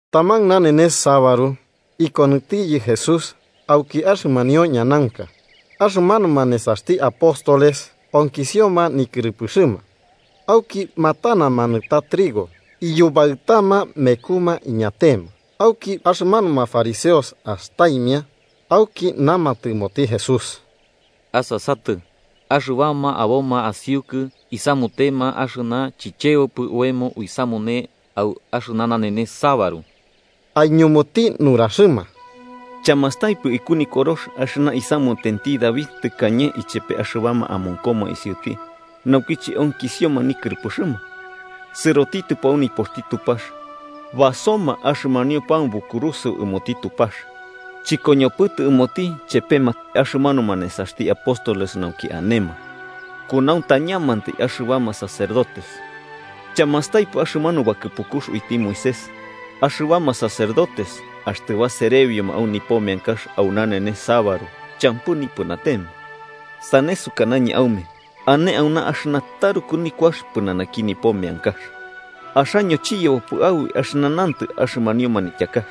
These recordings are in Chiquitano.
Taman nanenes sabaru, ikonɨtiyɨ Jesús auki axɨmanio ñanaunka. Axɨmanuma nesaxti apóstoles onkisioma nikɨrɨpɨxɨma, auki matanama nɨta trigo iyubaɨtama mekuma iñatema. Auki axɨmanuma fariseos astaimia, auki namatɨ ɨmoti Jesús: –Asasatɨ, axɨbama aboma asiukɨ isamutema axɨna chichebopɨ oemo uisamune au axɨna nanenes sabaru. Aiñumuti nuraxɨma: –¿Chamastaipɨ iku nikorox axɨna isamutenti David tɨkañe ichepe axɨbama amonkoma isiuti naukiche onkisioma nikɨrɨpɨxɨma? Sɨrotitɨpo au nipoxti Tupax basoma axɨmanio pan bokurusɨo ɨmoti Tupax, chɨkoñopɨtɨ ɨmoti chepema axɨmanuma nesaxti apóstoles nauki anema, kunauntañamantai axɨbama sacerdotes. ¿Chamastaipɨ axɨmanu bakɨpukux uiti Moisés, axɨbama sacerdotes axtɨ baserebioma au nipo meankax au nanenes sabaru champɨ nipɨnatema? Sane sukanañɨ aume ane auna axɨna taruku nikuax pɨnanaki nipo meankax. Axaño chiyebopɨ aboi axɨna nantɨ axɨmanio manityakax: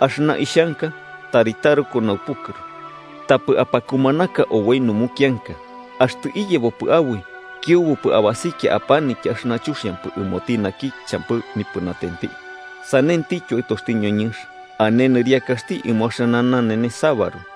‘Axɨna ixhanka tari taruku naupukɨru, tapɨ apakumanaka oboi numukianka.’ Axtɨ iyebopɨ aboi, kiubupɨ abasikia apanitya axɨna chuxiampɨ ɨmoti naki champɨ nipɨnatenti. Sanentityo Aɨtoxti ñoñɨnx, ane nɨriakaxti ɨmo axɨna nanenes sabaru.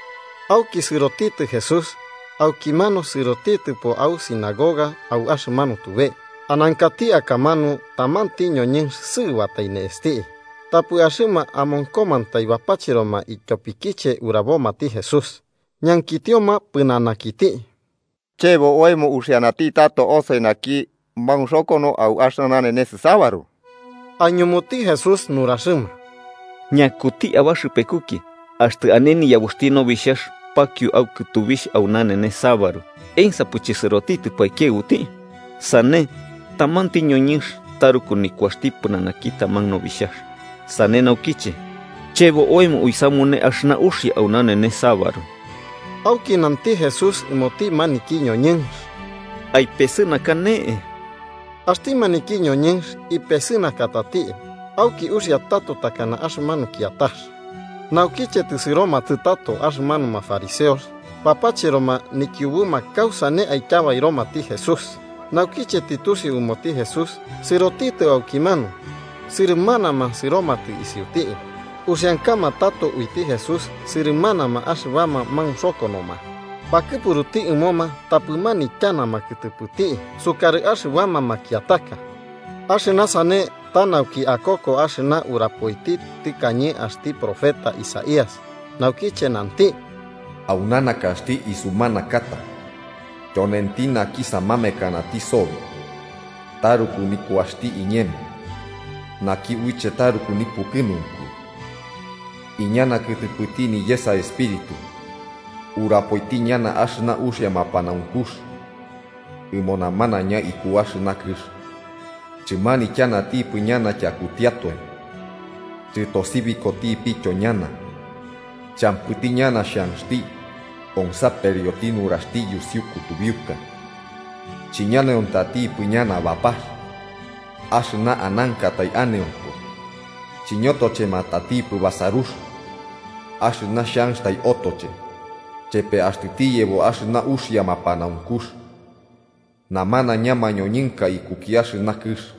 Auki sɨrotitɨ Jesús aukimanu sɨrotitɨpo au sinagoga au axɨmanu tube. Anankati akamanu tamanti ñoñɨnx sɨɨbatai ne'esti. Tapɨ axɨma amonkomantai bapacheroma ityopikiche urabomati Jesús, ñankitioma pɨnanakiti: –¿Chebo oemo uxianati tato osoi naki maunxokono au axɨna nanenes sabaru? Aiñumuti Jesús nuraxɨma: –¿Ñakuti abaxɨpekuki, axtɨ ane niyabuxti nobixhax pakio au kɨtubixh au nanenes sabaru, ensapɨ chɨsɨrotitɨpɨ aikiaɨbuti? Sane ¡tamanti ñoñɨnx taruku nikuaxti pɨnanaki taman nobixhax! Sane naukiche, chebo oemo uisamune axɨna uxia au nanenes sabaru. Auki nanti Jesús ɨmoti maniki ñoñɨnx: –Aipesɨnaka ne'e. Axti maniki ñoñɨnx ipesɨnakatati, auki uxia tato takana axɨmanu kiatax. Naukiche tɨsɨromatɨ tato axɨmanuma fariseos, bapacheroma nikiubuma kausane aityabairomati Jesús. Naukiche tɨtusiu ɨmoti Jesús, sɨrotitɨ aukimanu, sɨrɨmanama sɨromatɨ isiuti. Uxiankama tato uiti Jesús sɨrɨmanama axɨbama maunxokonoma, bakɨpuruti ɨmoma tapɨ manityanama kɨtɨpɨti sukarɨ axɨbama makiataka. Axɨna sane ta nauki akoko axɨna urapoiti tɨkañe axti profeta Isaías, naukiche nanti: “Auna nakaxti isumanakata, tyonenti naki samamekanati sobi, taruku nikuaxti iñemo, naki uiche taruku nipukɨnunku. Iñana kɨtɨpɨti niyesa Espíritu, urapoiti ñana axɨna uxia mapanaunkux ɨmo namanaiña iku axɨna kɨx. Chɨmanityanatipɨ ñana tyakutiatoe chɨtosibikotipityo ñana. Champɨti ñana xhanxti onsaperioti nuraxti yusiu kutubiuka. Chiñaneontatipɨ ñana bapax axɨna anankatai aneonko chiñotochematatipɨ basarux axɨna xhanxtai otoche, chepe axtɨ tiyebo axɨna uxia mapanaunkux. Namanaiña mañoñɨnka ikuki axɨna kɨx ñana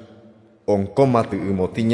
onkomatɨ ɨmoti.”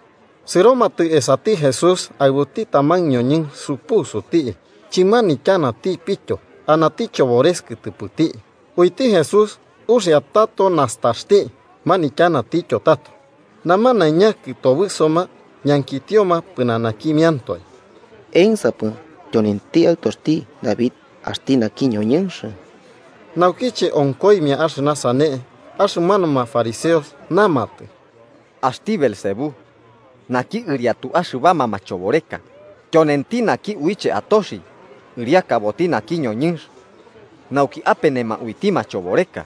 Sɨromatɨ esati Jesús aɨbuti taman ñoñɨnx supusuti chɨmanityanatipityo, anati chobores kɨtɨpɨti, uiti Jesús uxia tato nastaxti manityanatityo tato. Namanaiña kɨtobɨsoma ñankitioma pɨnanakimiantoe: “¿Ensapɨ tyonenti Aɨtoxti David axti naki ñoñɨnx?” Naukiche onkoimia axɨna sane, axɨmanuma fariseos namatɨ: “Axti Beelzebú, naki ɨriatu axɨbama machoboreka, tyonenti naki uiche atoxi ɨriakaboti naki ñoñɨnx nauki apenema uiti machoboreka.”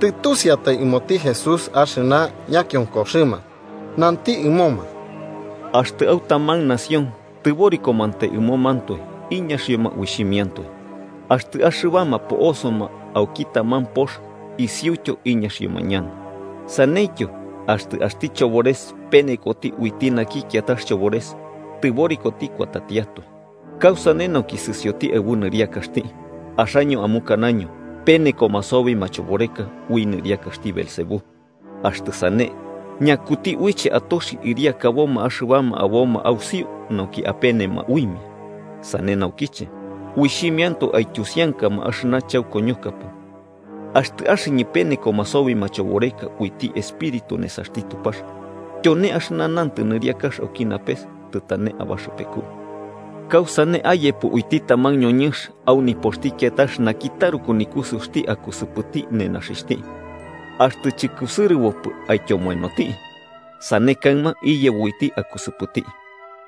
Tɨtusiatai ɨmoti Jesús axɨna ñakionkoxɨma, nanti ɨmoma: “Axtɨ au taman nación tɨborikomantai ɨmomantoe, iñaxioma uixhimiantoe. Axtɨ axɨbama po'osoma auki taman pox isiuityo iñaxioma ñana. Saneityo, axtɨ axti chobores penekoti uiti naki kiatax chobores, tɨborikoti kuatatiatoe. ¿Kausane, nauki sɨsioti aɨbu nɨriakaxti? Axaño amukanaño penekoma sobi machoboreka ui nɨriakaxti Beelzebú. Axtɨ sane, ¿ñakuti uiche atoxi ɨriakaboma axɨbama aboma ausiu nauki apenema uimia? Sane naukiche, uixhimiantoe aityusiankama axɨna chaukoñokapɨ. Axtɨ axɨñɨ penekoma sobi machoboreka uiti Espíritu nesaxti Tupax, tyone axɨna nantɨ nɨriakax auki napes tɨtane abaxɨpeku. “¿Kausane ayepo uiti taman ñoñɨnx au nipoxti kiatax naki taruku nikusɨuxti akusɨpɨti nenaxixhti, axtɨ chɨkusɨrɨbopɨ aityomoenoti? Sane kaɨma iyebo uiti akusɨpɨti.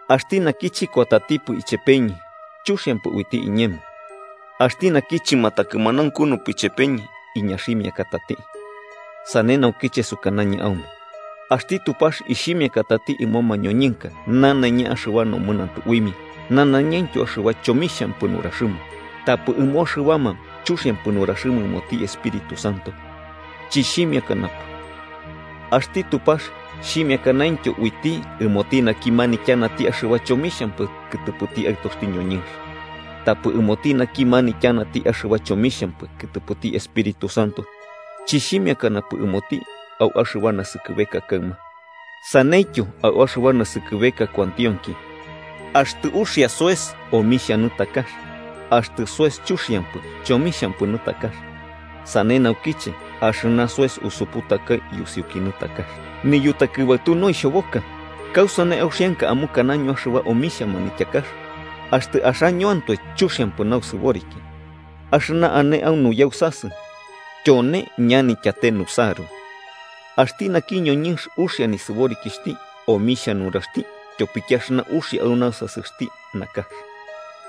“Axti naki chɨkuatatipɨ ichepeñɨ, chuxiampɨ uiti iñemo. Axti naki chɨmatakɨmanaunkunupɨ ichepeñɨ, iñaximiakatati. “Sane naukiche sukanañɨ aume axti Tupax ixhimiakatati ɨmo mañoñɨnka nanaiña axɨba nomɨnantɨ uimia nanaiñaintyo axɨba chomixhampɨ nuraxɨma, tapɨ ɨmo axɨbama chuxiampɨ nuraxɨma ɨmoti Espíritu Santo, chɨxhimiakanapɨ. Axti Tupax xhimiakanaintyo uiti ɨmoti naki manityanati axɨba chomixhampɨ kɨtɨpɨti Aɨtoxti ñoñɨnx. Tapɨ ɨmoti naki manityanati axɨba chomixhampɨ kɨtɨpɨti Espíritu Santo, chɨxhimiakanapɨ ɨmoti au axɨba naskɨbeka kaɨma, saneityo au axɨba naskɨbeka kuantionki. “Axtɨ uxia soes, omixhia nɨtakax. Axtɨ soes chuxiampɨ, chomixhampɨ nɨtakax. Sane naukiche axɨna soes usuputakai yusiuki nɨtakax. ¡Niyutakɨbaɨtu noixhoboka! ¿Kausane auxianka amukanaño axɨba omixhia manityakax, axtɨ axañoantoe chuxiampɨ nausɨboriki? Axɨna ane au nuyausasɨ, tyone ñanityate nusaru. Axti naki ñoñɨnx uxia nisɨborikixhti omixhia nuraxti tyopiki axɨna uxia au nausasɨxti nakax,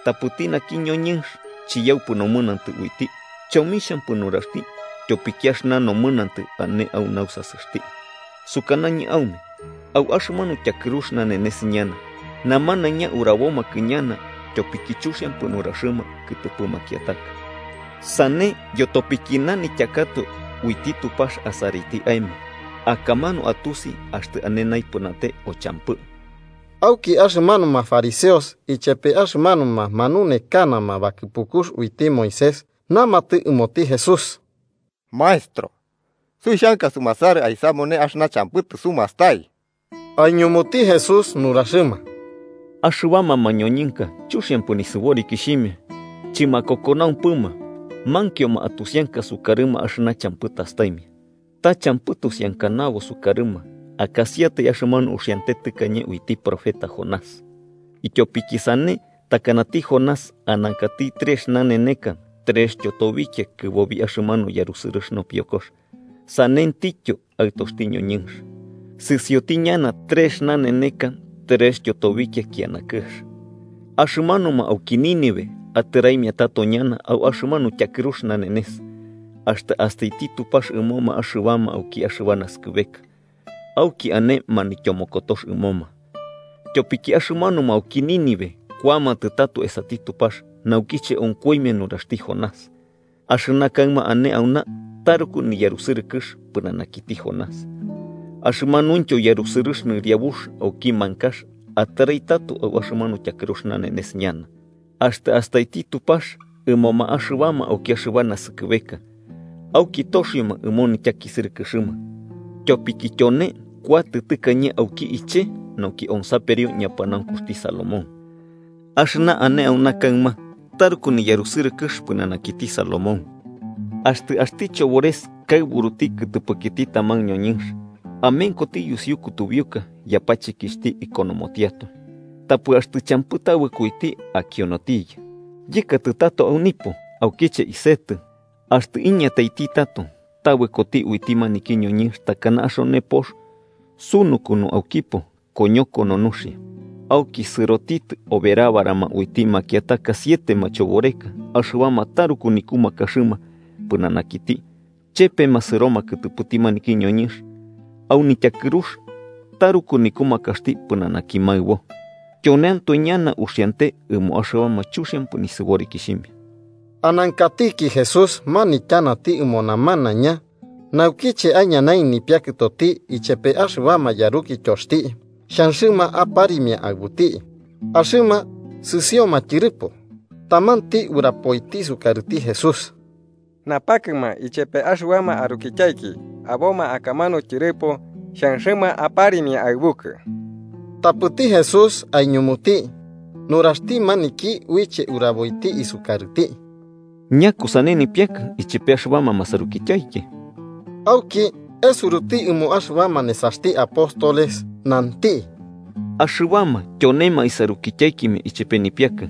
tapɨti naki ñoñɨnx chiyaupɨ nomɨnantɨ uiti chomixhampɨ nuraxti tyopiki axɨna nomɨnantɨ ane au nausasɨxti. Sukanañɨ aume au axɨmanu tyakɨrux nanenes ñana namanaiña urabomakɨ ñana tyopiki chuxiampɨ nuraxɨma kɨtɨpɨ makiataka. Sane yotopiki nanityakatoe uiti Tupax asaraiti aemo, akamanu atusi axtɨ ane naipɨnate o champɨ.” Auki axɨmanuma fariseos ichepe axɨmanuma manunekanama bakɨpukux uiti Moisés namatɨ ɨmoti Jesús: –Maestro, suixhanka sumasarɨ aisamune axɨna champɨ tɨsubastai. Aiñumuti Jesús nuraxɨma: –Axɨbama mañoñɨnka chuxiampɨ nisɨborikixhimia chɨmakokonaumpɨma mankioma atusianka sukarɨma axɨna champɨ tastaimia. Ta champɨ tusiankanabo sukarɨma akasiatai axɨmanu uxiante tɨkañe uiti profeta Jonás. Ityopiki sane takanati Jonás anankati trex naneka trextyo tobikia kɨbobi axɨmanu yarusɨrɨx nopiokox, sanentityoti Aɨtoxti ñoñɨnx, sɨsioti ñana trex naneneka trextyo tobikia kiana kɨx. Axɨmanuma auki Nínive atɨraimia tato ñana au axɨmanu tyakɨrux nanenes, axtɨ astaiti Tupax ɨmoma axɨbama auki axɨba naskɨbeka, auki ane manityomokotox ɨmoma. Tyopiki axɨmanuma auki Nínive kuamatɨ tato esati Tupax naukiche onkoimia nuraxti Jonás, axɨna kaɨma ane auna taruku niyarusɨrɨkɨx pɨnanakiti Jonás. Axɨmanuintyo yarusɨrɨx nɨriabux auki mankax atɨrai tato au axɨmanu tyakɨrux nanenes ñana, axtɨ astaiti Tupax ɨmoma axɨbama auki axɨba naskɨbeka, auki toxioma ɨmo nityakisɨrɨkɨxɨma. Tyopiki tyone kuatɨ tɨkañe auki iche nauki onsaperio ñapanaunkuxti Salomón, axɨna ane auna kaɨma taruku niyarusɨrɨkɨx pɨnanakiti Salomón. “Axtɨ axti chobores kaɨburuti kɨtɨpɨkiti taman ñoñɨnx, amenkoti yusiu kutubiuka yapachekixhti ikonomotiatoe. Tapɨ, axtɨ champɨ tabɨko uiti, akionotiyɨ: ‘Yɨkatɨ tato au nipo, aukiche isetɨ.’ Axtɨ iñataiti tato, tabɨkoti uiti maniki ñoñɨnx takana axone pox sunukunu aukipo koñokono nuxia. Auki sɨrotitɨ oberabarama uiti makiataka siete machoboreka axɨbama taruku nikumakaxɨma pɨnanakiti, chepema sɨroma kɨtɨpɨti maniki ñoñɨnx, au nityakɨrux taruku nikumakaxti pɨnanaki maɨbo. Tyoneantoe ñana uxiante ɨmo axɨbama chuxiampɨ nisɨborikixhimia.” Anankatiki Jesús manityanati ɨmo namanaiña, naukiche aiñanaimia nipiakɨtoti ichepe axɨbama yarukityoxti, xhanxɨma aparimia aɨbuti. Axɨma sɨsioma tyɨrɨpo, tamanti urapoiti sukarɨti Jesús: –Napakɨma ichepe axɨbama arukityaiki aboma akamanu tyɨrɨpo, xhanxɨma aparimia aɨbukɨ. Tapɨti Jesús aiñumuti nuraxti maniki uiche uraboiti isukarɨti: –¿Ñakusane nipiakɨ, ichepe axɨbama masarukityaiki? Auki, esuruti ɨmo axɨbama nesaxti apóstoles, nanti: –Axɨbama tyonema isarukityaikimia ichepe nipiakɨ.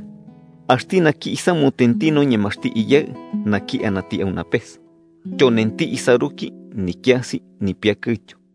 Axti naki isamutenti noñemaxti Iyaɨ naki anati au napes, tyonenti isaruki, nikiasi nipiakɨtyo.